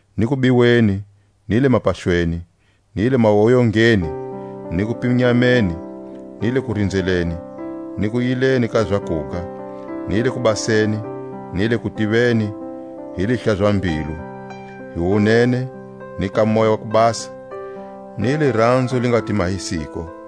ni kubiweni, ni le mapaxweni, ni le mawoyongeni, ni kupinyameni, ni le kurinzeleni, ni kuyileni ka zakuga, ni le kubaseni, ni le kutiveni, hi lihlaza-mbilu, hi wunene, ni ka Moya wa ku Basa, ni liranzo li nga ti mahisiko,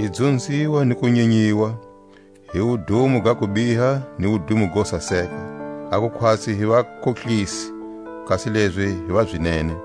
hi kudzunziwa ni ku nyenyiwa, hi wudumo ga kubiha ni wudumo go saseka; aku khwatsi hi vakohlisi, kasi lezi hi va zinene,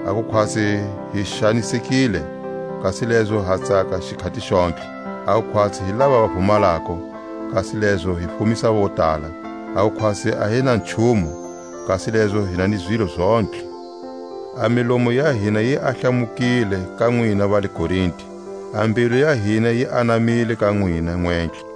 a ku khwatsi hi xanisekile, kasi lezo ha tsaka xikhati xontlhe; a ku khwatsi hi lava va vumalako, kasi lezo hi fumisa votala; a ku khwatsi a hi na nchumu, kasi lezo hi na ni zilo zontlhe. A milomu ya hina yi ahlamukile ka nwina va le Korinte, a mbilu ya hina yi anamile ka nwina nwentlhe.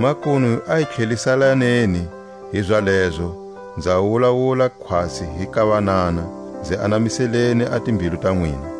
Makunu a hi tlheliselaneni hi zalezo (nza wulawula khwatsi hi ka vanana) nzi anamiseleni a timbilu ta nwina.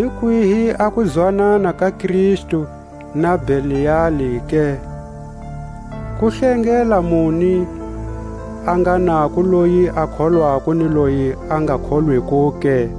Hi kwihi a kuzwanana ka Kristu na Beliali ke? Kuhlengela muni a nga nako loyi a kholwako ni loye a nga kholwiko ke?